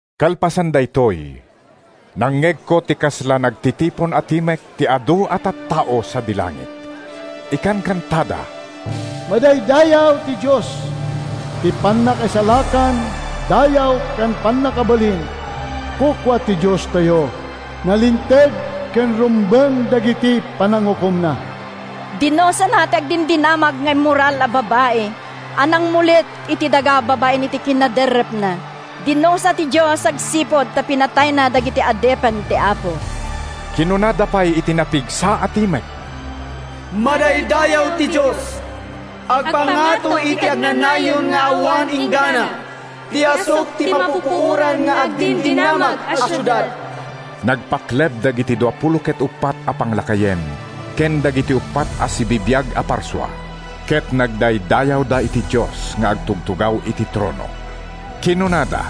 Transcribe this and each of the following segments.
Kalpasan daytoy, nangngegko ti kasla nagtitipon a timek ti adu a tattao sadi langit. Ikankantada: “Madaydayaw ti Dios! Ti pannakaisalakan, dayaw ken pannakabalin kukua ti Diostayo! Nalinteg ken rumbeng dagiti panangukomna. Dinusana ti agdindinamag nga immoral a babai a nangmulit iti daga babaen iti kinaderrepna. Dinusa ti Dios agsipud ta pinatayna dagiti adipen ti Apo.” Kinunada pay iti napigsa a timek: “Madaydayaw ti Dios! Agpangato iti agnanayon nga awan inggana ti asuk ti mapupuoran nga agdindinamag a siudad!” Nagpakleb dagiti duapulo ket uppat a panglakayen ken dagiti uppat a sibibiag a parsua, ket nagdaydayawda iti Dios nga agtugtugaw iti trono. Kinunada,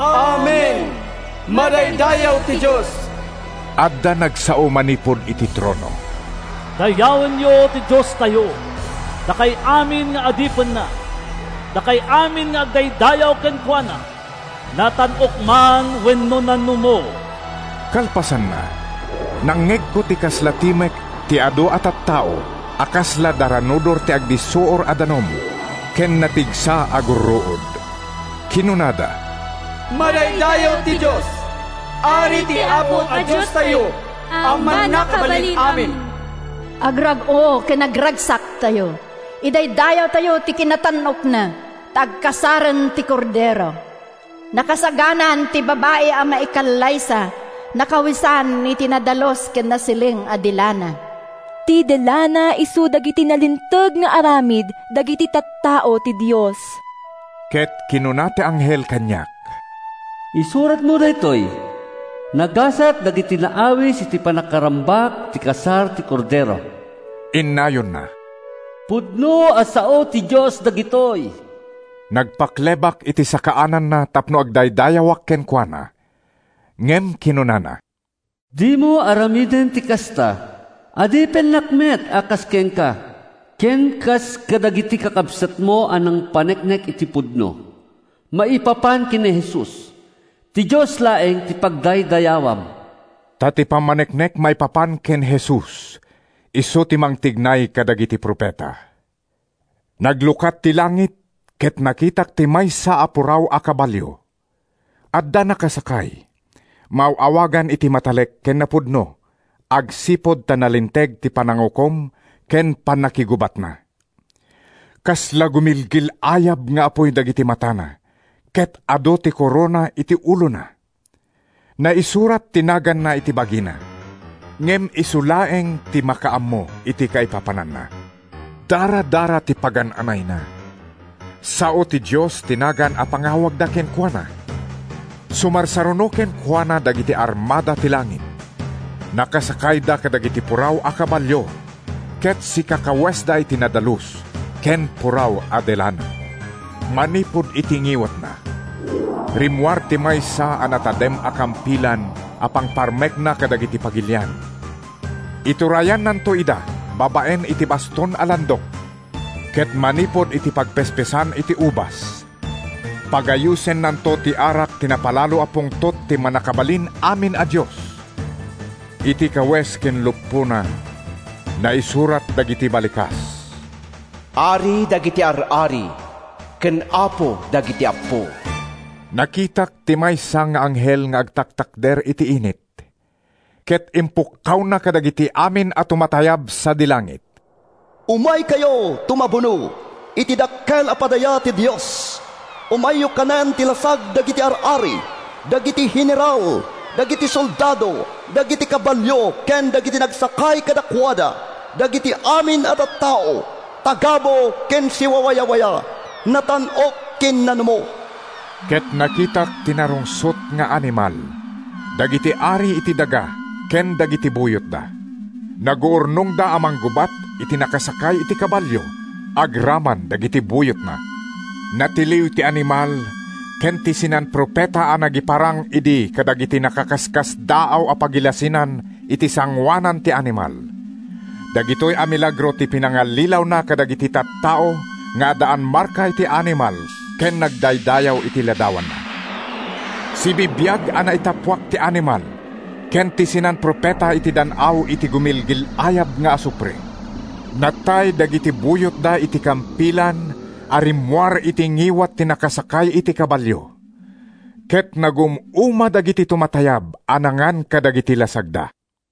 “Amen! Madaydayaw ti Dios!” Adda nagsao manipud iti trono: “Dayawenyo ti Diostayo, dakay amin nga adipenna, dakay amin nga agdaydayaw kenkuana, natan-ok man wenno nanumo!” Kalpasanna, nangngegko ti kasla timek ti adu a tattao a kasla daranudor ti agdissuor a danum ken napigsa a gurruod. Kinunada: “Madaydayaw ti Dios! Ari ti Apo a Diostayo a Mannakabalin-amin! Agrag-o ken agragsaktayo! Idaydayawtayo ti kinatan-okna, ta agkasaren ti Kordero! Nakasaganan ti Babai a Maikallaysa, nakawesan iti nadalus ken nasileng a de lana.” (Ti de lana isu dagiti nalinteg nga aramid dagiti tattao ti Dios.) Ket kinuna ti anghel kaniak, “Isuratmo daytoy: Nagasat dagiti naawis iti pannakarambak ti kasar ti Kordero.” Innayonna, “Pudno a sao ti Dios dagitoy.” Nagpaklebak iti sakaananna tapno agdaydayawak kenkuana, ngem kinunana, “Dimo aramiden ti kasta! Adipenak met a kas kenka ken kas kadagiti kakabsatmo a nangpaneknek iti pudno maipapan ken ni Jesus. Ti Dios laeng ti pagdaydayawam!” Ta ti pammaneknek maipapan ken ni Jesus isu ti mangtignay kadagiti profeta. Naglukat ti langit ket nakitak ti maysa a puraw a kabalio. Adda nakasakay. Maaw-awagan iti Matalek ken Napudno agsipud ta nalinteg ti panangukom ken pannakigubatna. Kasla gumilgil-ayab nga apuy dagiti matana ket adu ti korona iti ulona. Naisurat ti naganna iti bagina, ngem isu laeng ti makaammo iti kaipapananna. Daradara ti pagan-anayna. “Sao ti Dios” ti nagan a pangawagda kenkuana. Sumarsaruno kenkuana dagiti armada ti langit. Nakasakayda kadagiti puraw a kabalio ket sikakawesda iti nadalus ken puraw a de lana. Manipud iti ngiwatna, rimmuar ti maysa a natadem a kampilan a pangparmekna kadagiti pagilian. Iturayannanto ida babaen iti baston a landok, ket manipud iti pagpespesan iti ubas, pagayusennanto ti arak ti napalalo a pungtot ti Mannakabalin-amin a Dios. Iti kawes ken luppona, naisurat dagiti balikas: “Ari dagiti ar-ari ken Apo dagiti appo.” Nakitak ti maysa nga anghel nga agtaktakder iti init, ket impukkawna kadagiti amin a tumatayab sadi langit: “Umaykayo tumabuno iti dakkel a padaya ti Dios. Umayyo kanen ti lasag dagiti ar-ari, dagiti heneral, dagiti soldado, dagiti kabalio ken dagiti nagsakay kadakuada, dagiti amin a tattao, tagabu ken siwawayawaya, natan-ok ken nanumo.” Ket nakitak ti narungsot nga animal, dagiti ari iti daga ken dagiti buyotda. Naguurnongda a manggubat iti nakasakay iti kabalio agraman dagiti buyotna. Natiliw ti animal ken ti sinan-profeta a nagiparang idi kadagiti nakaskasdaaw a pagilasinan iti sangoanan ti animal. (Dagitoy a milagro ti pinangallilawna kadagiti tattao nga addaan marka iti animal ken nagdaydayaw iti ladawanna.) Sibibiag a naitappuak ti animal ken ti sinan-profeta iti dan-aw ti gumilgil-ayab nga asufre. Natay dagiti buyotda iti kampilan a rimmuar iti ngiwat ti nakasakay iti kabalio. Ket nagum-uma dagiti tumatayab a nangan kadagiti lasagda.